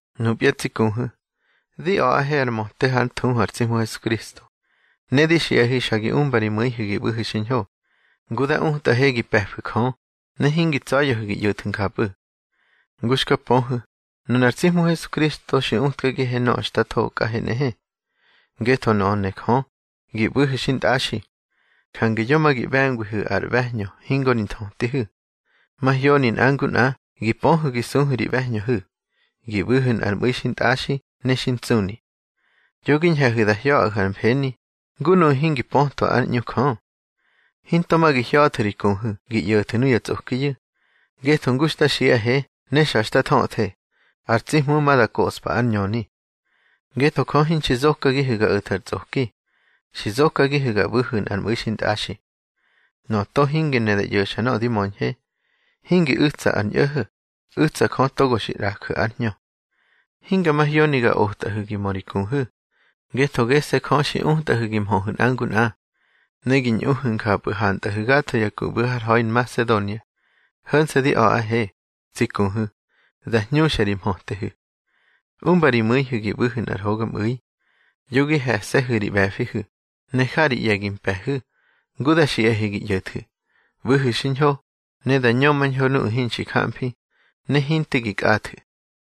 Nupya tsi kuhu̱, di a̱ꞌahe ar möte hár thuhu ar tsi Hmu Hesukristo, ne di xiꞌahe xa gi umba ri mu̱ihu̱ gi ꞌbu̱hu̱ xiñho, ngu da utꞌahe gi pe̱fu̱ Jö, ne hingi tsa̱ya̱hu̱ gi ꞌyo̱thu̱ njapꞌu̱. Ngu xka pöhu̱, nunar tsi Hmu Hesukristo xi utkagihe nöꞌö xta thokꞌahe nꞌehe. Ngetho nöꞌö ne Jö, gi ꞌbu̱hu̱ xintꞌaxi. Jange yo ma gi ꞌbe̱ngwihu̱ ar ꞌbe̱hñö hingo ri nthötihu̱. Mahyoni nꞌa ngu nꞌa gi pöhu̱ gi suhu̱ ri ꞌbe̱hñöhu̱, gi ꞌbu̱hu̱ nꞌar mꞌu̱i xintꞌaxi ne xi ntsꞌuni. Yo gi ñhe̱hu̱ da hya̱ꞌahu̱ ar mfeni, ngu nuꞌu̱ hingi pötwa ár ꞌñu Jö. Hinto ma gi hya̱thu̱ ri kuhu̱ gi ꞌyo̱thu̱ nuya tsꞌokiyu̱, ngetho ngu xta xiꞌahe ne xa xta thöthe, ar tsi Hmu ma da koꞌspa ár ñöni. Ngetho Jö hinxi zokagihu̱ ga o̱thu̱ ar tsꞌoki, xi zokagihu̱ ga ꞌbu̱hu̱ nꞌar mꞌu̱i xintꞌaxi. Nöꞌö to hingi ne da ꞌyo̱xa nöꞌö di möñhe, hingi u̱tsa ar ñꞌo̱ho̱, u̱tsa Jö togo xi ꞌraju̱ ár Hñö. Hinga mahyoni ga otꞌahu̱ gi mö ri kuhu̱, ngetho gese̱ Jö xi utꞌahu̱ gi mhöhu̱ nꞌa ngu nꞌa. Ne gi ñꞌuhu̱ njapꞌu̱ hantꞌahu̱ gatho ya ku ꞌbu̱ har ha̱i Nmasedonia. Ho̱nse̱ di a̱ꞌahe, tsi kuhu̱, da hñuxa ri mhötehu̱. Umba ri mu̱ihu̱ gi ꞌbu̱hu̱ nꞌar hogamꞌu̱i. Yo gi he̱se̱hu̱ ri ꞌbe̱fihu̱, ne ja ri ꞌye̱ gi mpe̱hu̱, ngu da xiꞌahe gi ꞌyo̱thu̱. ꞌBu̱hu̱ xiñho, ne da ñömañho nuꞌu̱ hinxi jamfi, ne hinte gi kꞌathu̱.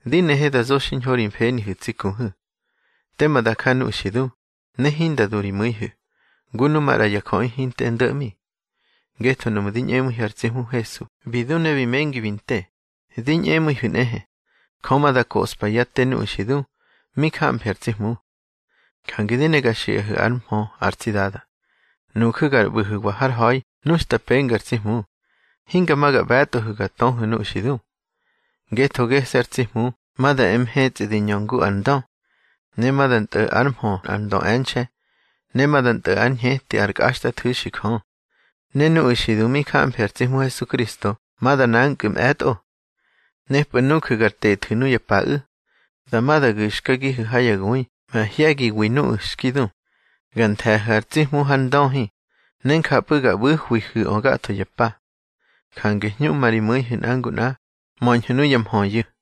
Di nehe da zo xiñho ri mfenihu̱ tsi kuhu̱, tema da ja nuꞌu̱ xi du, ne hinda du ri mu̱ihu̱, ngu nu maꞌra ya jöꞌi hinte ndo̱ꞌmi. Ngetho nuꞌmu̱ di ñꞌemu̱ihu̱ ar tsi Hmu Hesu bi du ne bi mengi bi nte, di ñꞌemu̱ihu̱ nꞌehe, Jö ma da koꞌspa yá te nuꞌu̱ xi du mi jamfi ar tsi Hmu. Jange di ne ga xiꞌahu̱ ár mhö ar tsi Dada: Nuju̱ gar ꞌbu̱hu̱wa har ha̱i nu xta penga ar tsi Hmu, hinga ma ga ꞌbe̱tꞌohu̱ ga töhu̱ nuꞌu̱ xi du. Ngetho gese̱ ar tsi Hmu ma da e mhetsꞌi di ñö ngu ar ndö, ne ma da ntꞌo̱ ár mhö nꞌar ndö e̱nxe̱, ne ma da ntꞌo̱ ár ñheti ár kꞌaxtꞌathu̱xi Jö. Ne nuꞌu̱ xi du mi jamfi ar tsi Hmu Hesukristo ma da nankꞌu̱ mꞌe̱tꞌo. Nepꞌu̱ nuju̱ gar tethu̱ nuya paꞌu̱, dama da gu̱xkagihu̱ ha ya gui mahye̱giwi nuꞌu̱ xki du, ga nthe̱hu̱ ar tsi Hmu har ndöhi, ne njapꞌu̱ ga ꞌbu̱hwihu̱ꞌö gatho ya pa. Jange hñuꞌma ri mu̱ihu̱ nꞌa ngu nꞌa, möñhu̱ nuya mhöyu̱.